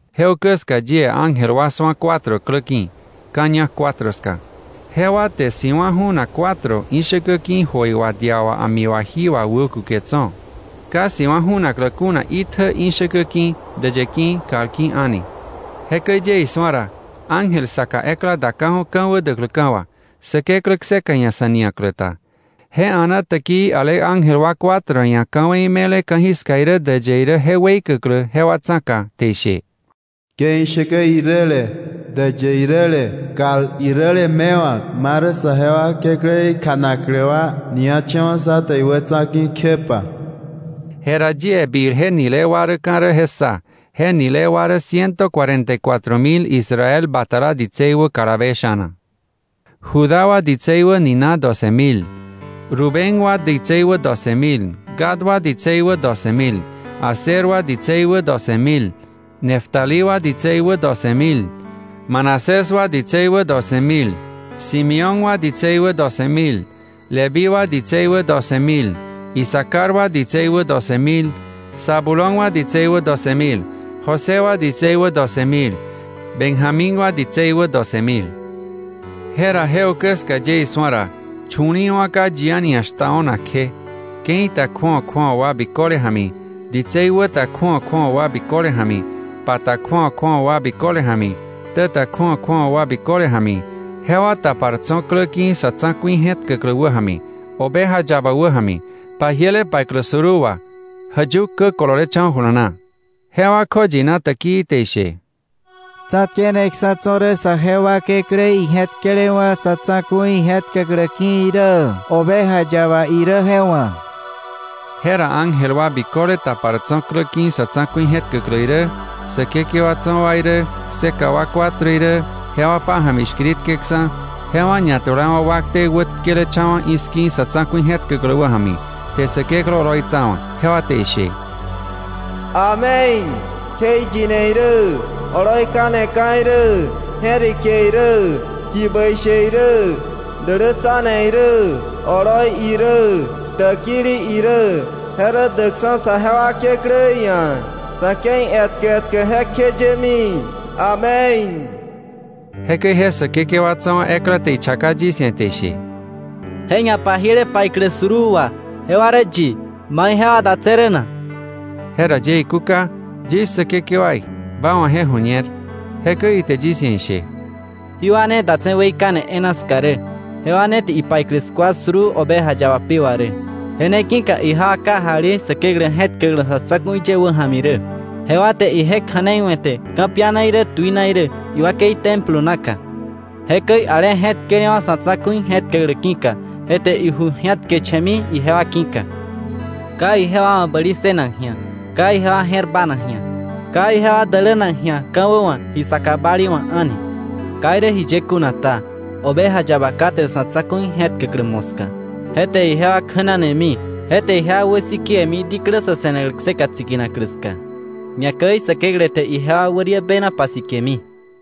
Je ukä ska yie ángel wa su̱a cuatro klä ki̱, ka̱ ñak cuatro ska. Jewa te si̱wa̱ ju̱nak cuatro ishäkä ki̱ jöi wà dia wà a̱mi wà jí wà wäkuke tso̱, ka si̱wa̱ ju̱naklä kuna itjä ishäkä ki̱, däyë ki̱, kal ki̱ a̱ni. Jekäi yie isu̱a ra, ángel saka ekla daka̱ju̱ ka̱wä däkläka̱ wà, Säkeklä kseka ia̱ sa̱ nia̱klä ta. Je a̱naa täkii ale ángel wa cuatro ia̱ ka̱wei me̱le ka̱jiska irä däyë irä je weikäklä jewa tsa̱ka, te ishe: “¡Ke ishäkä iräle, däyë iräle, kal iräle mewa̱k, marä saje wa Kekläí kjanaklä wa niacha̱wa̱ sá te iwätsa̱ ki̱ kjepa!” Jera yie bil je nile wa däka̱ rä je ssa: je nile wa rä ciento cuarenta y cuatro mil Israel batala ditsei wä kalabe sha̱na; Judá wa ditsei wä nina doce mil, Rubén wa ditsei wä doce mil, Gad wa ditsei wä doce mil, Aser wa ditsei wä doce mil, Neftalí wa ditsei wä doce mil, Manasés wa ditsei wä doce mil, Simeón wa ditsei wä doce mil, Leví wa ditsei wä doce mil, Isacar wa ditsei wä doce mil, Zabulón wa ditsei wä doce mil, José wa ditsei wä doce mil, Benjamín wa ditsei wä doce mil. Jera je ukä ska yie isu̱a ra, chu̱li̱i̱wa̱ ka yi a̱ni ia̱ shtao̱nak kje, ke̱i ta kju̱awa kju̱awa wa biköle ja̱mi, ditsei wä ta kju̱awa kju̱awa wa biköle ja̱mi, pa ta kju̱awa kju̱awa wa biköle ja̱mi, ktä ta kju̱awa kju̱awa wa biköle ja̱mi, jewa tapar tso̱ klä ki̱ sa̱ tsa̱ku̱i je̱tkäklä wäja̱mi, Oveja Yaba wäja̱mi, pajiele paiklä suruu wà, jäyuk kä kololecha̱wa̱ jula na. Jewa kjoyina täkii te ishe: “¡Tsa̱tkeneksa̱ tso̱ rä saje wa Kekläí je̱tkelewa̱ sa̱ tsa̱ku̱i je̱tkäklä ki̱ irä, Oveja Yaba irä je wa̱!” Jera ángel wa biköle tapar tso̱ klä ki̱ sa̱ tsa̱ku̱i je̱tkäklä irä, säkekewa tso̱ wa irä, kseka wa cuatro irä, jewa pája̱mi shkiritkeksa̱, jewa ñatulawa̱ wakte wätkelecha̱wa̱ i̱ski̱ sa̱ tsa̱ku̱i je̱tkäklä wäja̱mi, te Säkeklä oloitsawa̱; jewa te ishe: “¡Amén! Kjeiyine irä, oloi kaneka̱ irä, je̱rike irä, ji bäi she irä, dälätsane irä, oloi irä, täkili irä, je rä däkksa̱ saje wa Kekläí ia̱, sa̱ ke̱i etkä etkä jekjeyemi. ¡Amén!” Jekäi je säkekewa tso̱ wa ekla te ichaka yis ia̱, te ishe: “Je ñapajiele paiklä suruu wà, ¿jewa rä yi, mai jewa datse̱ rä na?” Je ra yie ikúka: “Yis Säkekewaí, ba wa̱ je ju̱ñer.” Jekäi ite yis ia̱ ishe: “Jí wa ne datse̱ weikane e̱e̱na ska rä, jewa ne te ipaiklä skua suruu Oveja Yaba pi wà rä. “Je ne ki̱ka ijewa kajali Säkeklä je̱tkäklä sa̱ tsa̱ku̱i ye wäja̱mi rä, jewa te ije kja̱nei we̱te ka̱piana irä tuina irä iwakei templo naka. Jekäi ale je̱tkelewa̱ sa̱ tsa̱ku̱i je̱tkäklä ki̱ka, je te iju ji̱atkecha̱mi ijewa ki̱ka. Ka ijewa wa̱ bäli ssënak ji̱a, ka ijewa je̱r banak ji̱a, ka ijewa dälänak ka̱wä wa̱, ji saka bali wa̱ a̱ni. Ka irä jiye kuna ta, Oveja Yaba kate sa̱ tsa̱ku̱i je̱tkäklä moska, je te ijewa kjänanemi, je te ijewa wäsikewe̱mi, diklä sa̱ se̱naklä kseka tsikinaklä ska, ñakäi Säkeklä te ijewa wäriä bena pasikemi.”